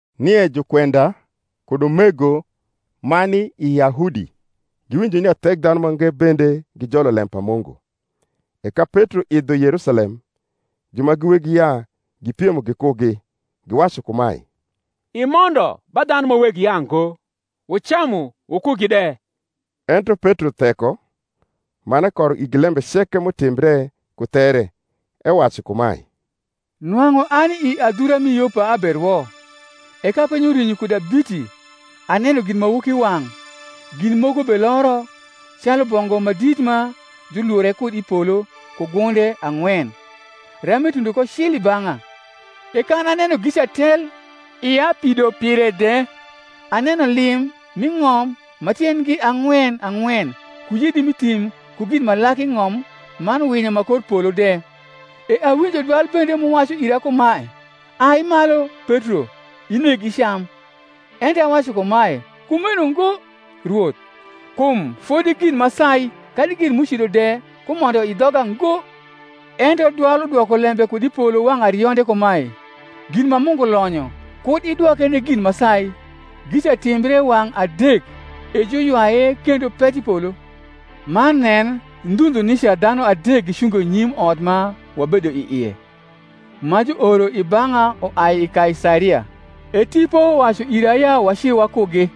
Nie jukwenda kud umego ma ni i Yahudi giwinjo nia Thekdhanumange bende gijolo lem pa Mungu. E ka Petro idho Yerusalem, ju ma gi weg yaa gipiemo gikugi, giwacu kumae, Imondo ba dhanu ma weg yaango, wucamu wukugi de. Ento Petro theko, man ekoro igi lembe ceke m’utimbre ku there, ewacu kumae, Nwang’u ani i adhura rni Yopa aberwo: e ka piny urwinyo kuda biti aneno ginmawokiwang’, gin moko beloro, calu bongu ma dit ma julure kud i polo ku gunde ang’wen; ram etundo ko cil i bang’a: e kan aneno gica tel, ia pido pire de, aneno lim m’i ng’om ma tiendgi ang’wen ang’wen ku yedi m’i thim ku gin ma lak i ng’om man winyo ma kor polo de. E awinjo dwal bende m’uwacu ira kumae. Ai malu, Petro; ineg icam. Ento awacu kumae, Kumeno ngo, Rwoth: kum fodi gin ma sai kadi gin m’ucido de kumondo i dhoga ngo. Ento dwal udwoko lembe kud i polo wang’ arionde kumae, Gin ma Mungu lonyo, kud idwoke ni gin ma sai. Gica timbre wang’ adek: e juywaye kendo pet i polo. Man nen, ndhu ndhu nica dhanu adek gicungo nyim ot ma wabedo i ie, ma juoro i bang’a uai i Kaisaria. E Tipo wacu ira ya waci wakugi,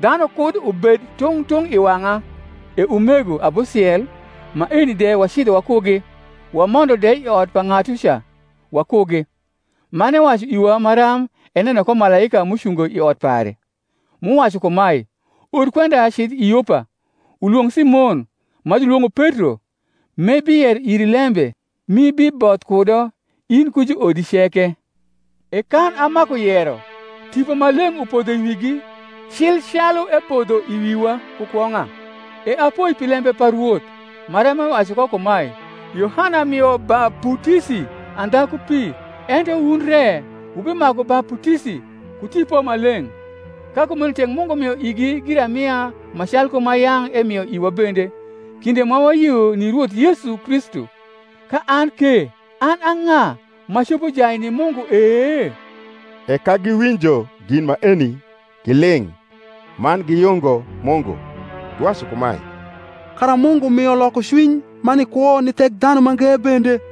dhanu kud ubed tung’ tung’ i wang’a. E umego abusiel maeni de wacidho wakugi; wamondo de i ot pa ng’atuca wakugi: man ewacu iwa maram eneno ko malaika m’ucungo i ot pare, m’uwacu kumae, Or kwenda cidh i Yopa, ulwong’ Simon, ma julwong’o Petro; m’ebiyero iri lembe, m’ibiboth kudo, in ku juodi ceke. E kan amaku yero, Tipo Maleng’ upodho i wigi, cil calu epodho i wiwa ku kwong’a. E apoi pi lembe pa Rwoth, maram ewacu ko kumae, Yohana mio baputisi andha ku pi; ento wun re wubimaku baputisi ku Tipo Maleng’. Ka kumeno tek Mungu mio igi giramia ma calku ma yang’ emio iwa bende, kinde ma wayio ni Rwoth Yesu Kristu, ka an ke an a ng’a, m’acopo jai ni Mungu e? E ka giwinjo gin maeni, giling’, man giyungo Mungu, giwacu kumae, Kara Mungu mio lokocwiny ma ni kwo ni Thekdhanumange bende.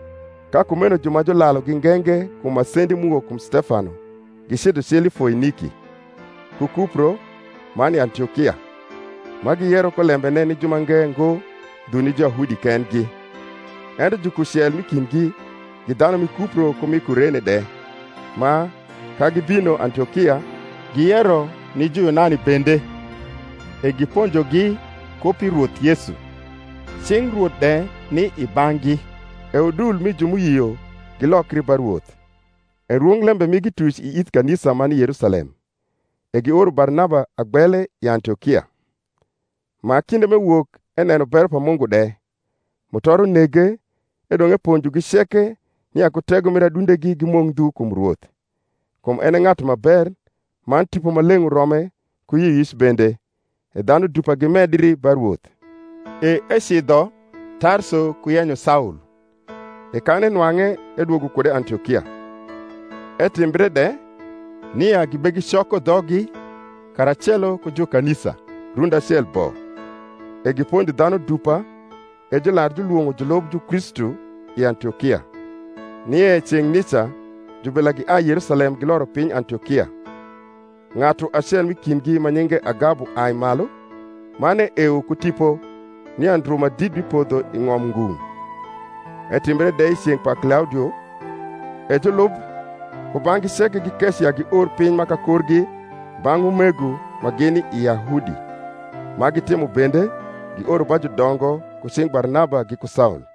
Ka kumeno ju ma julalugi nge nge kum masendi m’uwok kum Stefano gicidho cil i Foiniki, ku Kupro, rnan i Antiokia, ma giyero ko lembene ni jumange ngo ndhu ni Juyahudi kendgi. Ento jukucel m’i kindgi, gi dhanu mi Kupro ku mi Kurene de, ma, ka gibino Antiokia, giyero ni Juyunani bende, e giponjogi ku pi Rwoth Yesu. Cing Rwoth de ni i bang’gi: e udul mi ju m’uyio gilokri ba Rwoth. E rwonglembe migi tuc i ith kanisa ma ni i Yerusalem: e gioro Barnaba agbele i Antiokia: ma, kinde m’ewok, eneno bero pa Mungu de, mutoro nege; edong’ eponjogi ceke nia ku tego mir adundegi gimok ndhu kum Rwoth: kum en e ng’atu ma ber, man Tipo Maleng’ urome ku yioyic bende: e dhanu dupa gimedri ba Rwoth. E ecidho Tarso ku yenyo Saul; e kan enwang’e edwogo kude Antiokia. Etimbre de, nia gibegicoko dhoggi karacelo ku jukanisa rundi acel bo, e giponjo dhanu dupa; e jular julwong’o julub Jukristu i Antiokia. Nie ceng’ nica jubila giai i Yerusalem giloro piny Antiokia. Ng’atu acel m’i kindgi ma nyinge Agabu ai malu, man eewo ku Tipo nia ndru ma dit bipodho i ng’om ngung’: etimbre de i ceng’ pa Klaudio. E julub kubang’gi ceke gikeco ya gior piny ma kakorgi bang’ umego ma gini i Yahudi ma gitimo bende, gioro ba judongo ku cing’ Barnaba giku Saul.